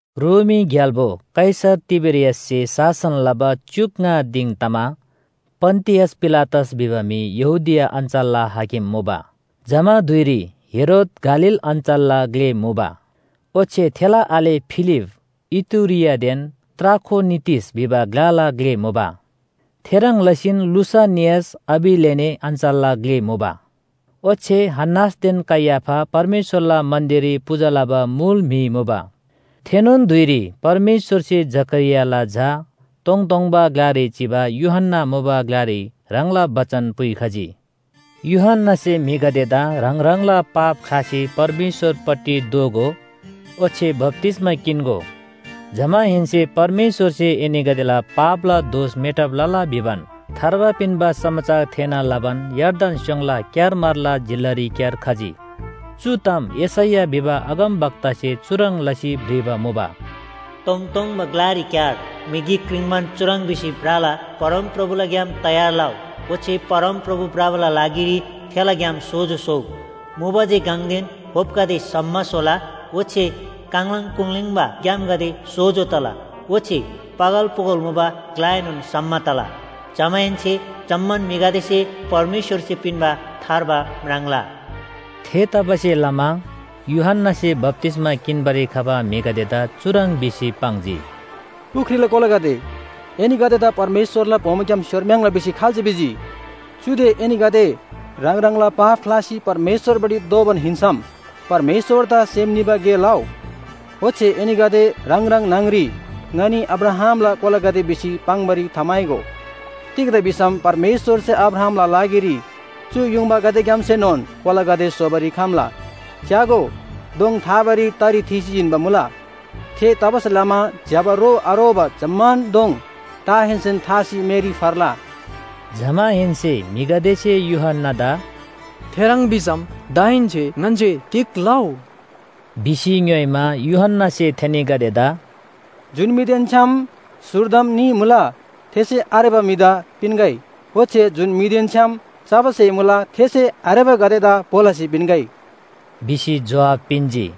रोमी ग्‍याल्‍बो कैसर तिबेरियाससे शासन लबा च्‍युक ङा दिङ तमा पन्‍तियस पिलातस भिबा म्‍हि यहूदिया अञ्‍चलला हाकिम मुबा। जमा धुइरी हेरोद गालील अञ्‍चलला ग्‍ले मुबा, ओच्‍छे थेला आले फिलिप इतुरियादेन त्राखोनितिस भिबा ग्‍लाला ग्‍ले मुबा, थेह्रङ् लसीन लुसानियास अबिलेने अञ्‍चलला ग्‍ले मुबा। ओच्‍छे हन्‍नासदेन कैयाफा परमेश्‍वरला मन्‍दिररी पूजा लबा मुल म्‍हि मुबा। थेनोन धुइरी परमेश्‍वरसे जकरियाला झा तोङतोङबा ग्‍लारी चिबा यूहन्‍ना मुबा ग्‍लारी ह्राङला बचन पुइखजी। यूहन्‍नासे म्‍हिगदेदा ह्राङ ह्राङला पाप ख्‍लासी परमेश्‍वरपट्टि दोःगो, ओच्‍छे बप्‍तिस्‍मा किन्‍गो। जमाहेन्‍से परमेश्‍वरसे एनीगदेला पापला दोष मेटब लला भिबान थार्बा पिन्‍बा समाचार थेःना लबान यर्दन स्‍योङला क्‍यारमारला जिल्‍लारीक्‍यार खजी। चु ताम यशैया भिबा अगमवक्तासे चुह्रङ् लसी भ्रिबा मुबा, “तोङतोङबा ग्‍लारीक्‍यार म्‍हि गिक क्रिङ्बान चुह्रङ् भिसी भ्रला, ‘परमप्रभुला ग्‍याम तयार लउ, ओच्‍छे परमप्रभु भ्रबाला लागिरी थेला ग्‍याम सोजो स्‍होउ, मुबा जे गङदेन होपगदे सम्‍म स्‍होला, ओच्‍छे काङलाङ कुङलीङबा ग्‍यामगदे सोजो तला ओच्‍छे पगल पोगल मुबा ग्‍लाएनोन सम्‍म तला। जमाहेन्‍से जम्‍मान म्‍हिगदेसे परमेश्‍वरसे पिन्‍बा थार्बा म्राङ्ला।’” थेतबासेलमा यूहन्‍नासे बप्‍तिस्‍मा किन्‍बारी खबा म्‍हिगदेदा चुह्रङ् भिसी पाङ्जी, “पुख्रीला कोलागदे, एनीगदेदा परमेश्‍वरला बोमोग्‍याम स्‍योरम्‍याङ्ला भिसी खाल्‍से भिजी? चुदे एनीगदे ह्राङ ह्राङला पाप ख्‍लासी परमेश्‍वरपट्टि दोःबान हिन्‍सम परमेश्‍वरदा सेम निबा गे लउ, ओच्‍छे एनीगदे ह्राङ ह्राङ न्‍हङरी ङनी अब्राहामला कोलागदे भिसी पाङ्‌बारी थाम्‍हाइगो। तिग्‍दा भिसम परमेश्‍वरसे अब्राहामला लागिरी चु युङबागदेग्‍यामसेनोन कोलागदे स्‍होबारी खम्‍ला। च्‍यागो, दोङ थाबारी तरी थीसी जिन्‍बा मुला। थेतबासेलमा ज्‍यबा रो आरोबा जम्‍मान दोङ टाहेन्‍सेन थासी मेरी फर्ला।” जमाहेन्‍से म्‍हिगदेसे यूहन्‍नादा “थेह्रङ् भिसम दाहेन्‍से ङन्‍से तिग लउ?” भिसी ङ्‌योइमा, यूहन्‍नासे थेनीगदेदा “जुन म्‍हिदेन छ्‌याम स्‍हुर्दम न्‍ही मुला थेसे आरेबा म्‍हिदा पिन्‍गै, ओच्‍छे जुन म्‍हिदेन छ्‌याम चबा स्‍हे मुला थेसे आरेबागदेदा भो लसी पिन्‍गै” भिसी जोहाब पिन्‍जी।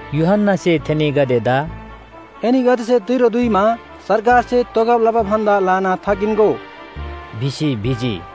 यूहन्‍नासे थेनीगदेदा “एनीगदेसे तिरो दुइमा सरकारसे तोगब लबा भन्‍दा ल्‍हाना थाकिन्‍गो” भिसी भिजी।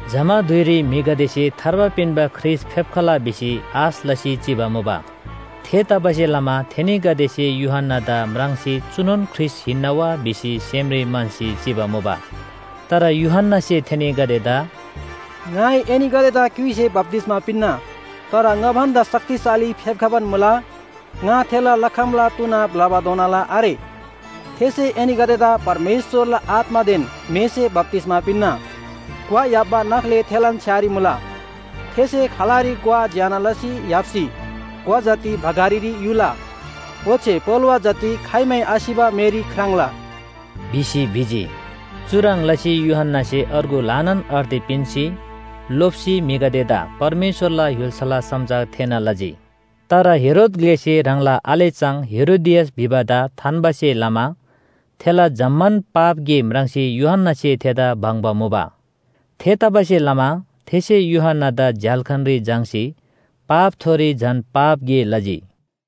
जमा धुइरी म्‍हिगदेसे थार्बा पिन्‍बा ख्रीष्‍ट फेप्‍खला भिसी आश लसी चिबा मुबा। थेतबासेलमा थेनीगदेसे यूहन्‍नादा म्राङ्सी चुनोन ख्रीष्‍ट हिन्‍ना वा भिसी सेमरी म्‍हन्‍सी चिबा मुबा। तर यूहन्‍नासे थेनीगदेदा “ङाइ एनीगदेदा क्‍युइसे बप्‍तिस्‍मा पिन्‍ना। तर ङा भन्‍दा शक्तिशाली फेप्‍खबान मुला ङा थेला लखमला तुना ब्‍लबाधोनाला आरे। थेसे एनीगदेदा परमेश्‍वरला आत्‍मादेन मेसे बप्‍तिस्‍मा पिन्‍ना। ग्‍वा य्‍हाप्‍बा नाख्‍ले थेलान छ्‌यारी मुला। थेसे खलारी ग्‍वा ज्‍यना लसी य्‍हाप्‍सी ग्‍वा जति भकारीरी युला। ओच्‍छे पोलोवा जति खाइमै आसिबा मेरी ख्राङ्ला” भिसी भिजी। चुह्रङ् लसी यूहन्‍नासे अर्गु ल्‍हानान अर्ती पिन्‍सी, लोप्‍सी म्‍हिगदेदा परमेश्‍वरला य्‍हुल्‍साला समाचार थेःना लजी। तर हेरोद ग्‍लेसे ह्राङला आले चाङ हेरोदियास भिबादा थान्‍बासे लमा थेला जम्‍मान पाप गे म्राङ्सी यूहन्‍नासे थेदा बङ्बा मुबा। थेतबासेलमा थेसे यूहन्‍नादा झ्‍याल्‍खानरी झाङ्‌सी पापथोरी झन पाप गे लजी।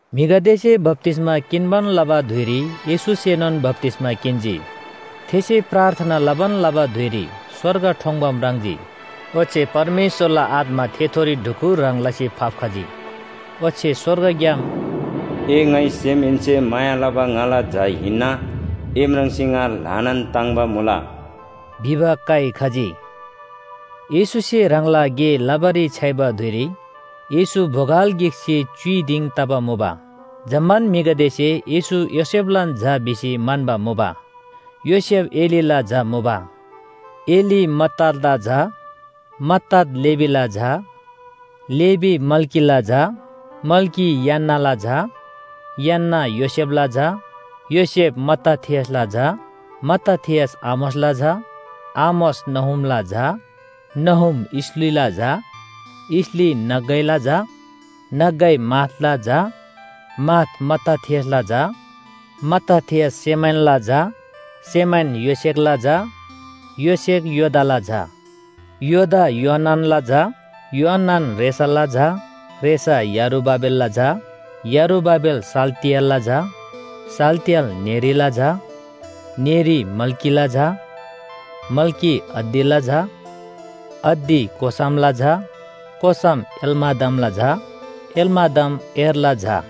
म्‍हिगदेसे बप्‍तिस्‍मा किन्‍बान लबा धुइरी येशूसेनोन बप्‍तिस्‍मा किन्‍जी। थेसे प्रार्थना लबान लबा धुइरी स्‍वर्ग ठोङ्‌बा म्राङ्जी। ओच्‍छे परमेश्‍वरला आत्‍मा थेथोरी ढुकुर ह्रङ् लसी फाप्‍खजी। ओच्‍छे स्‍वर्गग्‍याम “ए ङाइ सेमहेन्‍से माया लबा ङाला झा हिन्‍ना, ए म्राङ्सी ङा ल्‍हानान ताङ्‍बा मुला” भिबा काइ खजी। येशूसे ह्राङला गे लबारी छ्‌याइबा धुइरी येशू बोगल गिकसे च्‍युइ दिङ तबा मुबा। जम्‍मान म्‍हिगदेसे येशू योसेफलान झा भिसी म्‍हन्‍बा मुबा। योसेफ एलीला झा मुबा। एली मत्तातला झा, मत्तात लेवीला झा, लेवी मल्‍कीला झा, मल्‍की यान्‍नाला झा, यान्‍ना योसेफला झा, योसेफ मत्ताथियासला झा, मत्ताथियस आमोसला झा, आमोस नहूमला झा, नहूम इसलीला झा, इसली नग्‍गैला झा, नग्‍गै माथला झा, माथ मत्ताथियासला झा, मत्ताथियस सेमैनला झा, सेमैन योसेखला झा, योसेख योदाला झा, योदा योआननला झा, योआनन रेसाला झा, रेसा यरुबाबेलला झा, यरुबाबेल शालतिएलला झा, शालतिएल नेरीला झा, नेरी मल्‍कीला झा, मल्‍की अद्दीला झा, अद्दी कोसामला झा, कोसाम एलमादमला झा, एलमादम एर्‌ला झा,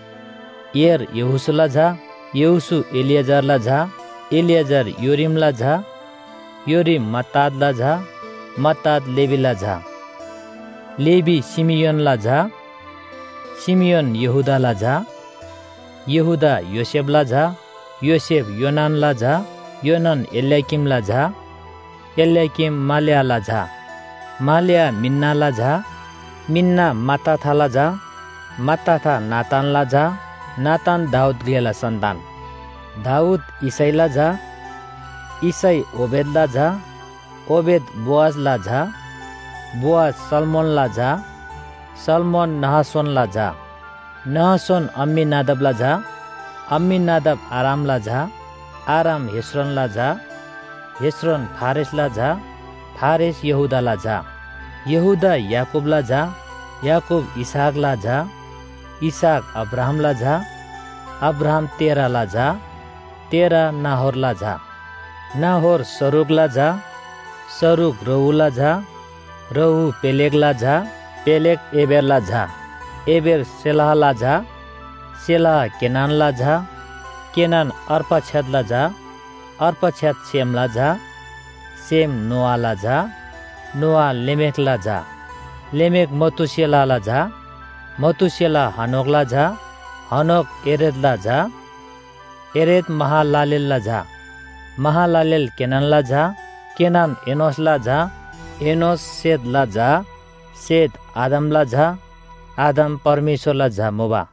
एर् यहोशूला झा, यहोशू एलीएजरला झा, एलीएजर योरीमला झा, योरीम मत्तातला झा, मत्तात लेवीला झा, लेवी शिमियोनला झा, शिमियोन यहूदाला झा, यहूदा योसेफला झा, योसेफ योनानला झा, योनान एल्‍याकीमला झा, एल्‍याकीम मलेआला झा, मलेआ मिन्‍नाला झा, मिन्‍ना मत्ताथाला झा, मत्ताथा नातानला झा, नातान दाऊद ग्‍लेला सन्‍तान, दाऊद यिशैला झा, यिशै ओबेदला झा, ओबेद बोअजला झा, बोअज सल्‍मोनला झा, सल्‍मोन नहशोनला झा, नहशोन अम्‍मीनादाबला झा, अम्‍मीनादाब आरामला झा, आराम हेस्रोनला झा, हेस्रोन फारेसला झा, फारेस यहूदाला झा, यहूदा याकूबला झा, याकूब इसहाकला झा, इसहाक अब्राहामला झा, अब्राहाम तेरहला झा, तेरह नाहोरला झा, नाहोर सरूगला झा, सरूग रऊला झा, रऊ पेलेगला झा, पेलेग एबेरला झा, एबेर शेलहला झा, शेलह केनानला झा, केनान अर्पक्षदला झा, अर्पक्षद शेमला झा, शेम नोआला झा, नोआ लेमेखला झा, लेमेख मतूशेलहला झा, मतूशेलह हनोकला झा, हनोक येरेदला झा, येरेद महलालेलला झा, महलालेल केनानला झा, केनान एनोशला झा, एनोश शेतला झा, शेत आदमला झा, आदम परमेश्‍वरला झा मुबा।